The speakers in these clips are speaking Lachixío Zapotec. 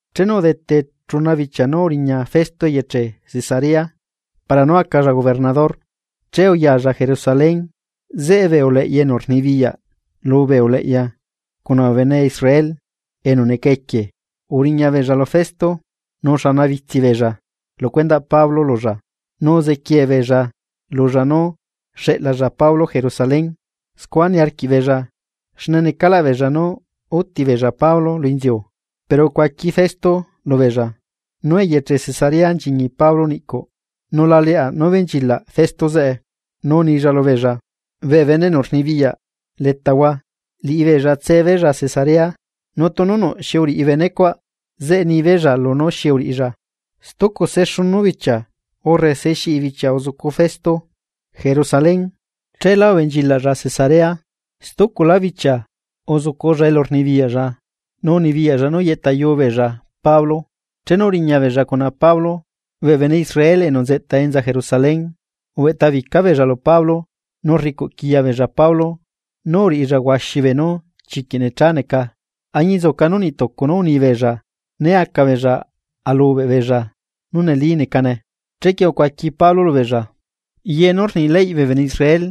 Chenu udete chuna bichia nú uriña Festo eyeche Cesarea para nú acalla gobernador, che uyalla Jerusalén, zeꞌe bee uleꞌya enu rnibiyaꞌ lubee uleꞌya cuna bee bene Israel enu neca equie uriñabeella lu Festo nu uxanabitsi beella lu cuendaꞌ Pablo lulla. Nu uziquiee beella lulla nú xeꞌlalla Pablo Jerusalén. Scua niarquiꞌbeella xne necaꞌlaꞌ beella nú úti beella Pablo lu inziu. Pero ucuaqui Festo lubeella nú eyeche Cesarea nchiñi Pablo niꞌcuꞌ, nu la leaꞌ nú benchilaꞌ Festo zeꞌe, nu unilla lubeella: ―Bee bene enu rnibiyaꞌ letahua, liꞌibeella tsebeella Cesarea, nu tunu nuꞌ xi uriꞌi benecuaꞌ, zeꞌe nibeella lunú xi uriꞌilla. Stucu se xunu bichia urre se xiꞌi bichia uzucu Festo Jerusalén, cheela ubenchilaꞌlla Cesarea. Stuculá bichia uzuculla elu rnibiyaꞌlla. Nu unibiyaꞌlla nú yeꞌta yuu beella Pablo. Chenu uriña beella cuna Pablo, bee bene Israel enu nzeꞌta enza Jerusalén, ubeꞌtabica beella lu Pablo nu rricuꞌquiya beella Pablo nú uriꞌilla huaxi beenu chiquiꞌ necha neca añinzuca nú niꞌ tucu nú unibeella né aca beella alubeꞌ beella nú neli necane. Chequie ucuaqui Pablo lubeella: ―Ye nú rni leyꞌ bee bene Israel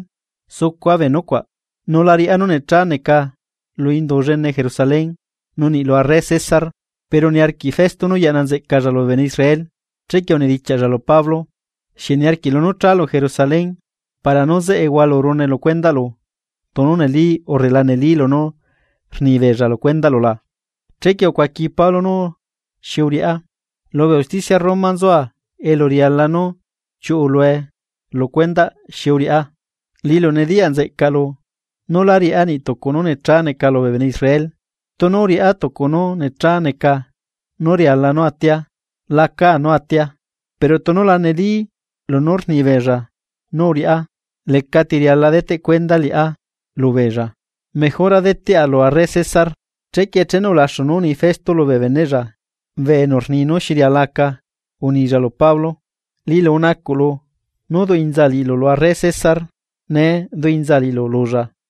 sucua bee nucuaꞌ, nu lá riꞌá nú necha neca lu Indu llene Jerusalén nu niꞌ lu arre César. Pero niarquiꞌ Festo nú yaꞌna nzeꞌcalla lubee bene Israel, chequie unidichiaꞌlla lu Pablo: ―¿Xieꞌ niarquiꞌlu nú chalu Jerusalén para nú zeꞌe hualurune lu cuendaꞌlu tunu neli urre la neli lunú rni beella lu cuendaꞌlu la? Chequie ucuaqui Pablo nú unilla: ―Lubee usticia Roma nzua elu riala nú chiuꞌulue lu cuendaꞌ nú xi uriꞌá, liꞌilu nediyaꞌ nzeꞌcaꞌlu nú lá riꞌá niꞌ tucu nú necha neca lubee bene Israel. Tunu uriꞌá tucu nú necha neca nú riala nú atia, lacá nú atia. Pero tunu la neli ye lunú rnibeella nú uriꞌá, lecati riala deteꞌ cuenda liꞌá lubeella mejora deteꞌa lu arre César. Chequie chenu ulaxu nú uni Festo lubee beneꞌlla enu rni nú xi riala aca, unilla lu Pablo: ―Liꞌilu unacuꞌlu nú duꞌinzaa liꞌilu lu arre César. Nee duꞌinzaa aliꞌilu lulla.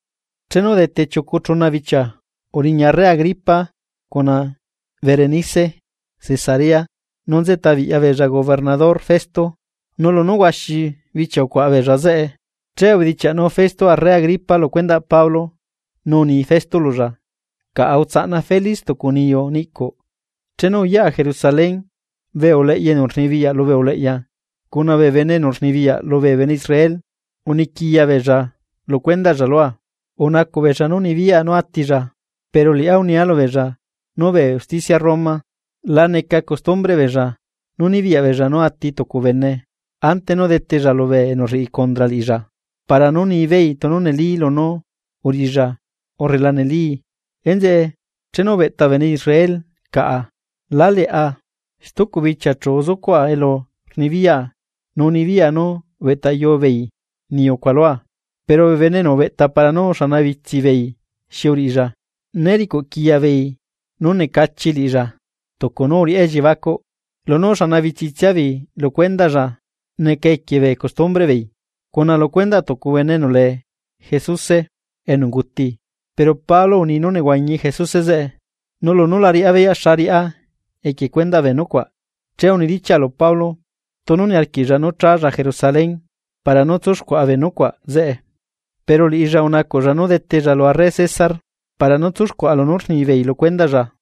Chenu udete chiucu chuna bichia, uriña arre Agripa cuna Berenice Cesarea nu nzeꞌta biꞌyabeella gobernador Festo. Nu lunú huaxi bichia ucuaꞌa beella zeꞌe, che ubedichiaꞌnu Festo arre Agripa lu cuendaꞌ Pablo, nu uni Festo lulla: ―Caꞌa utsaꞌna Felix tucu niyu niꞌcuꞌ. Chenu uyaꞌa Jerusalén, bee uleꞌya enu rnibiyaꞌ lubee uleꞌya cuna bee bene enu rnibiyaꞌ lubee bene Israel uniquiya beella lu cuendaꞌlla lua, rnacuꞌ beella nú nibiyaꞌa nú atilla. Pero liꞌá unia lubeella nú bee usticia Roma la neca costumbreꞌ beella nú nibiyaꞌ beella nú ati tucu bene ante nú detella lubee enu rriꞌi condra liꞌilla para nú nibeei tunu neli lunú uriꞌilla urre la nelii. Enzeꞌe, chenu ubeꞌta bee bene Israel caꞌa, la leꞌa, stucu bichia chu uzucuaꞌa lu xleta elu rnibiyaꞌa nu unibiyaꞌa nú ubeꞌtayu beei niyu cuaꞌ lua. Pero bee bene enu ubeꞌta para nú uxanabitsi beei xi uriꞌilla, né ricuꞌ quiya beei nú necha neca liꞌilla tucu nú uriꞌá elliebacuꞌ. Lunú uxana bitsitsiabeei lu cuendaꞌlla neca equie bee costumbreꞌbeei, cuna lu cuendaꞌ tucu bene enu lee Jesuse enu unguti, pero Pablo uni nú nehuañi Jesuse zeꞌe. Nu lunú la riꞌá beyaꞌ xa riꞌá equie cuendaꞌ bee nucuaꞌ, che unidichiaꞌa lu Pablo tunu niarquiꞌlla nú chálla Jerusalén para nú tsúxcuaꞌa bee nucuaꞌ zeꞌe. Pero liꞌilla unacuꞌlla nú detella lu arre César para nú tsúxcuaꞌa lunú rnibeei lu cuendaꞌlla,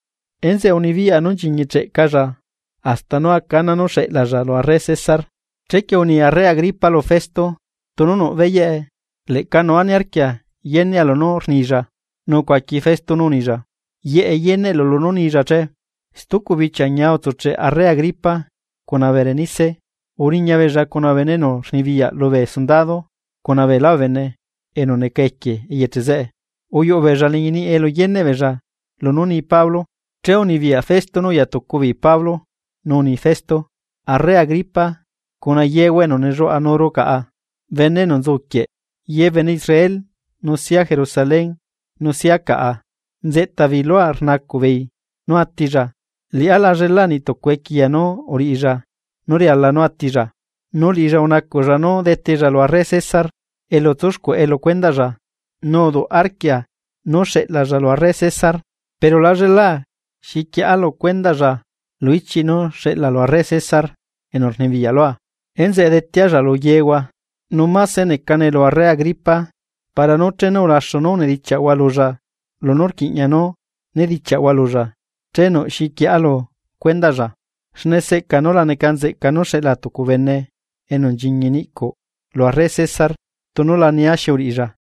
enzeꞌe unibiyaꞌa nú nchiñicheꞌcalla hasta nú aca ana nú xeꞌlaalla lu arre César. Chequie uni arre Agripa lu Festo: ―Tunu nuꞌ beyaꞌe, leꞌca nua niarquia yenea lunú rnilla. Nu ucuaqui Festo nú unilla: ―Yeꞌe yeneꞌlu lunú nilla che. Stucu bichia, ñia utsucheꞌ arre Agripa cuna Berenice uriña beella cuna bee bene enu rnibiyaꞌ lubee sundado cuna beelá bee bene enu neca equie eyeche zeꞌe, uyuꞌu beella liñi niꞌi elu yeneꞌ beella lunú ni Pablo, che unibiyaꞌ Festo nú uyatucu beei Pablo, nu uni Festo: ―Arre Agripa, cuna yehua enu nelluaꞌanuru caꞌa. Bene enu nzuquieꞌ, ye bene Israel nu sia Jerusalén nu sia caꞌa, nzeꞌta beei lua rnacuꞌ beei nú atilla. Liꞌá la llela niꞌtucu equiya nú uriꞌilla nú riala nú atilla. Nu liꞌilla unacuꞌlla nú detella lu arre César elu tsuxcuaꞌe lu cuendaꞌlla, nu uduꞌ arquia nú xeꞌlalla lu arre César. Pero lállelaa xi quieꞌa lu cuendaꞌlla lu ichiꞌ nú xeꞌla lu arre César enu rnibiyaꞌ lua, enzeꞌe detealla lu yehua, nu máse necane lulu arre Agripa para nú chenu ulaxu nú unidichiaꞌhua lulla lunú rquiꞌña nú nedichiaꞌhua lulla, che nuꞌ xi quieꞌa lu cuendaꞌlla. Xne seꞌca nú la neca nzeꞌca nú xeꞌla tucu bene enu nchiñi niꞌcuꞌ lu arre César, tunu la nia xi uriꞌilla.